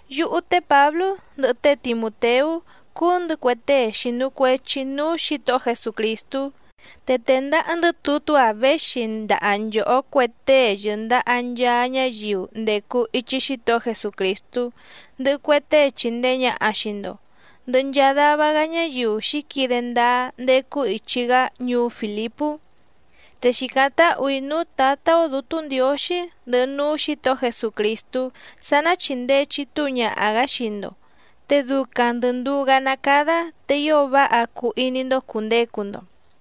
Yúhú té Pǎblú ndɨhɨ té Timùteú cúú‑ndɨ̌ cue tée xìnu cuechi núú Xǐtohó Jesucrìstú, te tèndaha‑ndɨ́ tutú‑a véxi ndaha nchòhó cue tée yɨ̀ndaha nchaa ñáyiu ndècu ichi Xítohó Jesucrìstú, ndɨhɨ cue tée chìndee ñaha xii‑ndo, ndɨhɨ nchaa dava‑gá ñáyiu xǐquide ndáá ndécú ìchi‑gá ñuú Fìlipú. Te xìcáⁿ táhù‑í núú Tǎtá‑ó Dǔtú Ndiǒxí ndɨhɨ núú Xǐtohó Jesucrìstú sá ná chìndee chitúu ñaha‑gá xii‑ndo, te ducaⁿ ndɨ̀ nduú‑gá ná cádá te ío váha cuu iní‑ndó cùndecu‑ndo.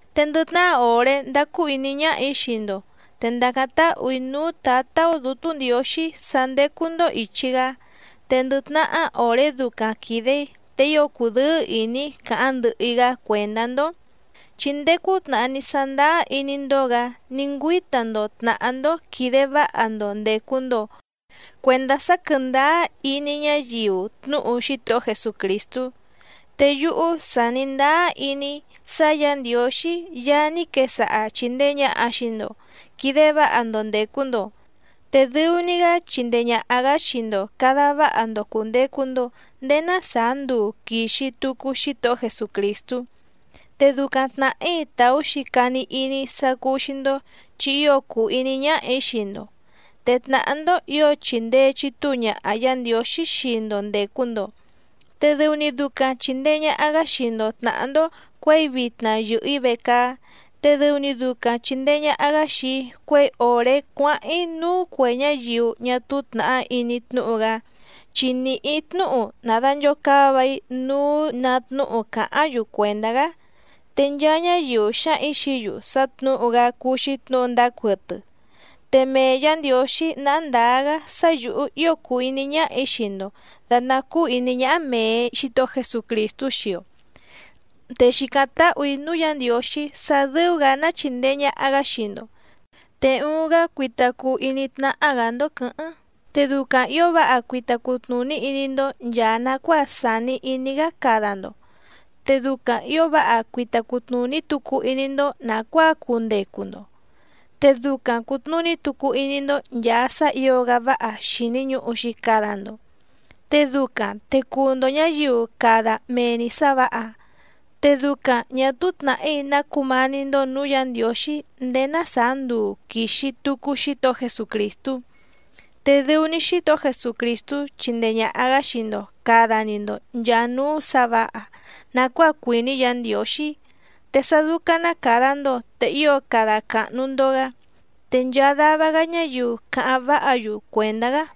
Te ndɨ tnahá òré ndácú ìní ñáhà‑í xii‑ndo, te ndàcáⁿ táhù‑í núú Tǎtá‑ó Dǔtú Ndiǒxí sá ndécú‑ndó ìchi‑gá. Te ndɨ tnahá òré ducaⁿ quìde‑í te ío cùdɨ́ɨ́ ìní‑í càháⁿ ndɨhɨ‑í‑gá cuèndá‑ndó. Chi ndéé cútnàhá ní sándáá iní‑ndó‑gǎ ní ngüíta‑ndo tnàhá‑ndó quìde váha‑ndo ndècu‑ndo cuendá sá quɨ̀ndáá iní ñáyiu tnúhu Xítohó Jesucrìstú. Te yúhú sàni ndáá iní‑í sá Yǎ Ndiǒxí Yaá ní quesaha chìndee ñaha xii‑ndo quide váha‑ndo ndècu‑ndo, te dɨu‑ni‑gá chindee ñàha‑gá xii‑ndo càda váha‑ndo cùndecu‑ndo ndéé ná sàá nduu quìxi tucu Xítohó Jesucrìstú. Te ducaⁿ tnàhí tàú‑xi cani iní‑í sá cúú‑xí‑ndó, chi ío cùu iní ñáhà‑í xii‑ndo. Te tnàhá‑ndó ǐo chìndee chitúu ñaha Yǎ Ndiǒxí xii‑ndo ndècu‑ndo, te dɨu‑ni ducaⁿ chìndee ñaha‑gá xii‑ndo tnàhá‑ndó cuěi vitna yɨ̀hɨ‑í vecaá, te dɨu‑ni ducaⁿ chìndee ñaha‑gá xii‑í cuěi òré cuáháⁿ‑í núú cuè ñáyiu ñá túú tnàhá iní tnúhu‑gá, chi nìhí‑í tnúhu nàdanchocáva‑í nǔu ná tnúhu càháⁿ‑yu cuèndá‑gá, te nchaa ñáyiu xǎhaⁿ‑ǐ xií‑yu sá tnǔhu‑gá cúú‑xí tnǔhu ndáá cuɨtɨ. Te mee Yǎ Ndiǒxí náhá ndǎá‑gá sá yǔhú ío cùu iní ñáhà‑í xii‑ndo dàtná cúú ìní ñáhá mèe Xítohó Jesucrìstú xii‑o. Te xìcáⁿ táhù‑í núú Yǎ Ndiǒxí sá dɨ́ú‑gǎ ná chìndee ñaha‑gá xii‑ndo te uuⁿ‑gá cuita cuu iní tnáhá‑gǎ‑ndó quɨ̌hɨ́ⁿ, te ducaⁿ ǐo váha cuita cutnùní iní‑ndó nchàa nacuáa sàni iní‑gá cada‑ndo, te ducaⁿ ǐo váha cuita cutnùní tucu iní‑ndó nàcuáa cundecu‑ndo. Te ducaⁿ cùtnuní tucu iní‑ndó nchàa sá ǐo‑gá váha xìni ñuhu‑xi cada‑ndo, te ducaⁿ te cuu‑ndo ñǎyiu cada mee‑ni sǎ vǎha, te ducaⁿ ñà túú tnàhí ná cùmání‑ndó nǔú Yǎ Ndiǒxí ndéé ná sàá nduu quìxi tucu Xítohó Jesucrìstú. Te dɨu‑ni Xítohó Jesucrìstú chindee ñàha‑gá xii‑ndo càda‑ni‑ndo nchaa núú sǎ vǎha nàcuáa cuìní Yǎ Ndiǒxí. Te sá dúcáⁿ ná càda‑ndo te ío cada càhnu‑ndo‑gá, te nchaa dava‑gá ñáyiu cáháⁿ váha‑yu cuèndá‑gá.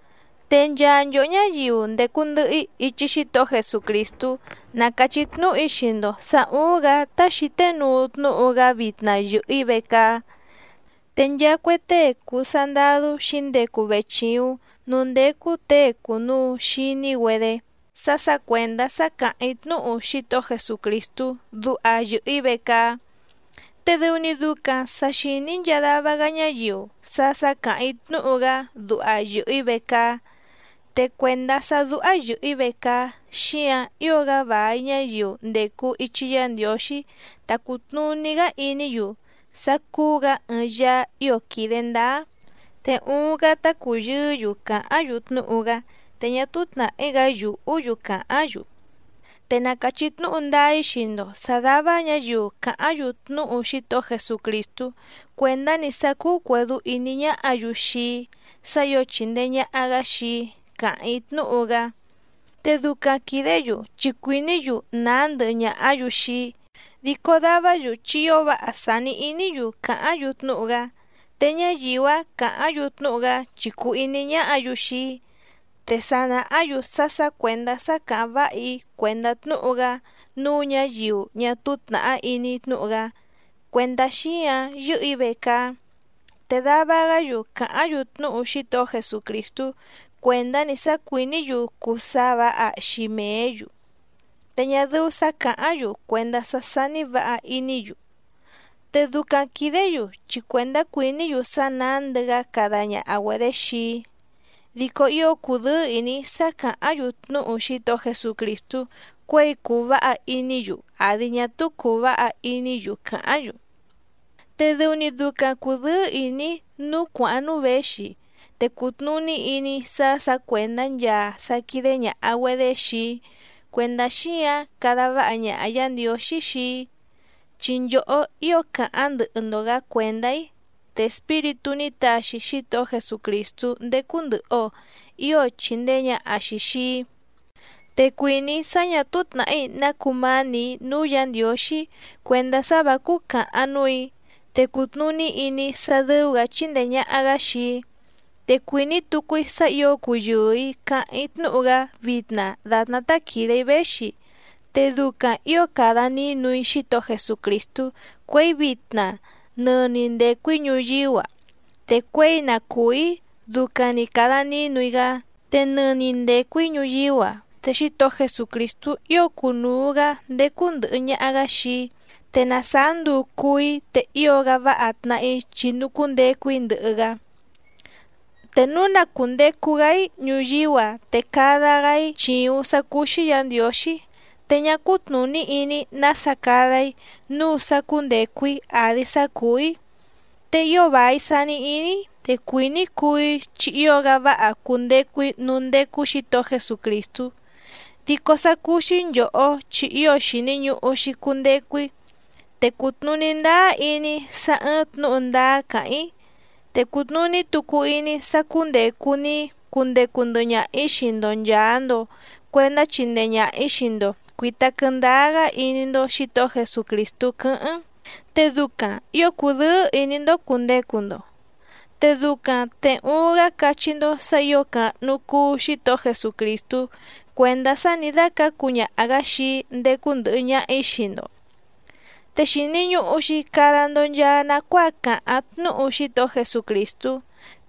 Te nchaa nchòhó ñáyiu ndècu ndɨhɨ‑í ichi Xítohó Jesucrìstú na càchí tnúhu‑í xii‑ndo sǎ úúⁿ‑gǎ tá xǐté nuu tnúhu‑gá vitna yɨ̀hɨ‑í vecaá. Te nchaa cue tée cùu sandadú xǐndecu vechìuⁿ núú ndécú těe cùnuu xiní‑güedé sá sǎ cuèndá sá càháⁿ‑í tnúhu Xítohó Jesucrìstú duha yɨ̀hɨ‑í vecaá, te dɨu‑ni ducaⁿ sà xiní nchaa dava‑gá ñáyiu sá sǎ càháⁿ‑í tnúhu‑gá duha yɨ̀hɨ‑í vecaá. Te cuèndá sá dúhá yɨ̀hɨ‑í vecaá xíǎⁿ ío‑gá vài ñáyiu ndècu ichi Yá Ndiǒxí ta cùtnuní‑gá iní‑yu sá cúú‑gǎ ɨɨⁿ Yaá ío quìde ndáá, te uuⁿ‑gá tá cùyɨɨ́‑yu càháⁿ‑yu tnúhu‑gá, te ñá túú tnàhí‑gá yùhú‑yu càháⁿ‑yu. Te na càchí‑í tnúhu ndáá‑í xii‑ndo sǎ dàva ñáyiu càháⁿ‑yu tnúhu Xítohó Jesucrìstú cuèndá‑ni sá cúú cuèdú iní ñáhǎ‑yu xii‑í sá ǐo chìndee ñaha‑gá xii‑í càháⁿ‑í tnúhu‑gá. Te ducaⁿ quìdé‑yu chi cuìní‑yu nàá ndɨhɨ ñàhá‑yu xii‑í, dico davá‑yu chi ío váha sàni iní‑yu càháⁿ‑yu tnúhu‑gá. Te ñáyiu‑áⁿ càháⁿ‑yu tnúhu‑gá chi cùu iní ñáhǎ‑yu xii‑í, te sa nàhá‑yu sá sǎ cuèndá sá càháⁿ váha‑í cuèndá tnúhu‑gá núú ñǎyiu ñá túú tnàhá iní tnúhu‑gá, cuèndá xíǎⁿ yɨ́hɨ̀‑í vecaá. Te dava‑gá‑yu càháⁿ‑yu tnúhu Xítohó Jesucrìstú cuèndá‑ni sá cuìní‑yu cuu sá vǎha xii mèé‑yu, te ñá dɨ́ú sǎ càháⁿ‑yu cuèndá sá sání vǎha iní‑yu. Te ducaⁿ quìdé‑yu chi cuèndá cuìní‑yu sá nǎndɨ‑gá cada ñaha‑güedě xii‑í. Dico ío cùdɨ́ɨ́ ìní‑í sá càháⁿ‑yu tnúhu Xítohó Jesucrìstú cuěi cùu váha iní‑yu àdi ñá túú cùu váha iní‑yu càháⁿ‑yu. Te dɨu‑ni ducaⁿ cùdɨ́ɨ́ ìní‑í núú cuàháⁿ núú věxi. Te cùtnuní iní‑í sá sǎ cuèndá nchaa sá quídé ñàha‑güedé xii‑í, cuèndá xíǎⁿ cada váha ñaha Yǎ Ndiǒxí xii‑í, chi nchòhó ío càháⁿ ndɨhɨ‑ndo‑gǎ cuèndá‑í, te Espíritú ní taxi Xítohó Jesucrìstú ndécú ndɨ̀hɨ‑o ío chìndee ñaha‑xi xii‑í. Te cuìní‑í sá ñà túú tnàhí ná cumánì‑í núú Yǎ Ndiǒxí cuèndá sá vǎ cúú càhaⁿ núù‑í, te cùtnuní iní‑í sá dɨ́ú‑gǎ chindee ñàha‑gá xii‑í. Te cuìní tucu‑í sá ǐo cuyɨɨ‑ǐ cáháⁿ‑í tnúhu‑gá vitna dàtná tá quìde‑í véxi, te ducaⁿ ǐo cada nínu‑í Xítohó Jesucrìstú cuěi vitna nɨni ndècu‑í ñuyíú‑a te cuěi na cùú‑í ducaⁿ‑ni càda nínu‑í‑gá. Te nɨni ndècu‑í ñuyíú‑a te Xítohó Jesucrìstú ío cùnuu‑gá ndécú ndɨ̀hɨ ñaha‑gá xii‑í, te na sàá nduu cùú‑í te ío‑gá váha tnahá‑í chi nucúndecu‑í ndɨhɨ‑gá. Te núu na cùndecu‑gá‑í ñuyíú‑a te cada‑gá‑í chìuⁿ sá cúú‑xí Yǎ Ndiǒxí, te ñá cútnùní iní‑í nása cada‑í nǔu sá cúndècu‑í àdi sá cùú‑í. Te ío vài sani iní‑í te cuìní‑í cuú‑í chi ío‑gá váha cundecu‑í núú ndécú Xǐtohó Jesucrìstú. Dico sá cúú‑xí nchòhó chi ío xìni ñuhu‑xi cundecu‑í. Te cùtnuní ndáá iní‑í sá ɨ̀ɨⁿ tnúhu ndáá càháⁿ‑í, te cùtnuní tucu iní‑í sá cúndècu‑ni‑í cundecu ndɨhɨ ñaha‑ǐ xii‑ndo nchàa‑ndo cuendá chindee ñàha‑í xii‑ndo cuìta quɨndáá‑gá iní‑ndó Xǐtohó Jesucrìstú quɨ́hɨ́ⁿ, te ducaⁿ ǐo cudɨ́ɨ́ ìní‑ndó cùndecu‑ndo. Te ducaⁿ te uuⁿ‑gá cachí‑ndó sǎ ǐo càhnu cuu Xítohó Jesucrìstú cuèndá sá nǐ dácǎcu ñaha‑gǎ xii‑í ndécú ndɨ̀hɨ ñaha‑í xii‑ndo. Te xìni ñuhu‑xi cada‑ndo nchaa nacuáa càháⁿ tnúhu Xítohó Jesucrìstú.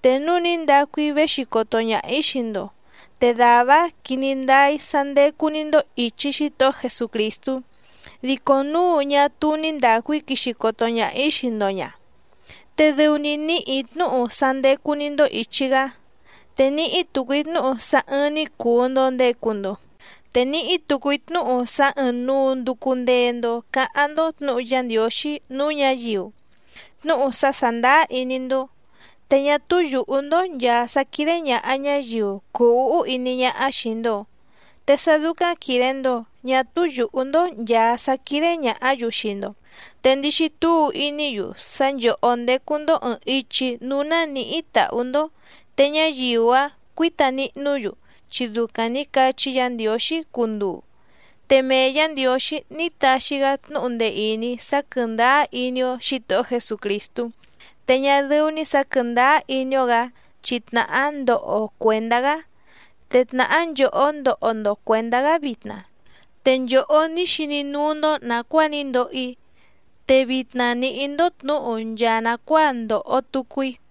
Te núu ní ndacu‑í véxi coto ñaha‑ǐ xii‑ndo, te dàvá‑áⁿ quiní ndáá‑í sá ndécú‑ní‑ndó ìchi Xítohó Jesucrìstú. Dico núu ñá túú ní ndàcu‑í quixi coto ñaha‑ǐ xii‑ndo ña, te dɨu‑ni níhì‑í tnúhu sá ndécú‑ní‑ndó ìchi‑gá, te níhí tucu‑í tnúhu sá ɨ́ɨ́ⁿ‑ní cùu‑ndo ndecu‑ndo, te níhí tucu‑í tnúhu sá ɨ̀ɨⁿnuu nducu ndee‑ndo caháⁿ‑ndó tnǔhu Yá Ndiǒxí núú ñǎyiu, tnúhu sá sàndáá iní‑ndó. Te ñá túú yùhú‑ndó nchàa sá quídé ñàha ñáyiu cùu úhú iní ñáhá xìi‑ndo, te sá dúcáⁿ quìde‑ndo ñá túú yùhú‑ndó nchàa sá quídé ñàhá‑yu xii‑ndo, te ndìxi túu iní‑yu sá nchòhó ndécú‑ndó ɨ̀ɨⁿ ichi núú nánìhí tàhú‑ndó, te ñáyiu‑áⁿ cuǐta nihnú‑yu, chi ducaⁿ nǐ cachí Yǎ Ndiǒxí cunduu. Te mee Yǎ Ndiǒxí ní taxi‑gá tnúhu ndee ìní sá quɨ̀ndáá iní‑ó Xǐtohó Jesucrìstú, te ñá dɨ́ú‑ní sǎ quɨ̀ndáá iní‑ó‑gǎ chi tnàhá ndoho‑o cuèndá‑gá. Te tnàhá nchòhó ndóhó‑ndó cuèndá‑gá vitna, te nchòhó ní xiní núú‑ndó nàcuáa ní ndoho‑í, te vitna nìhí‑ndó tnǔhu nchaa nàcuáa ndòho tucu‑í.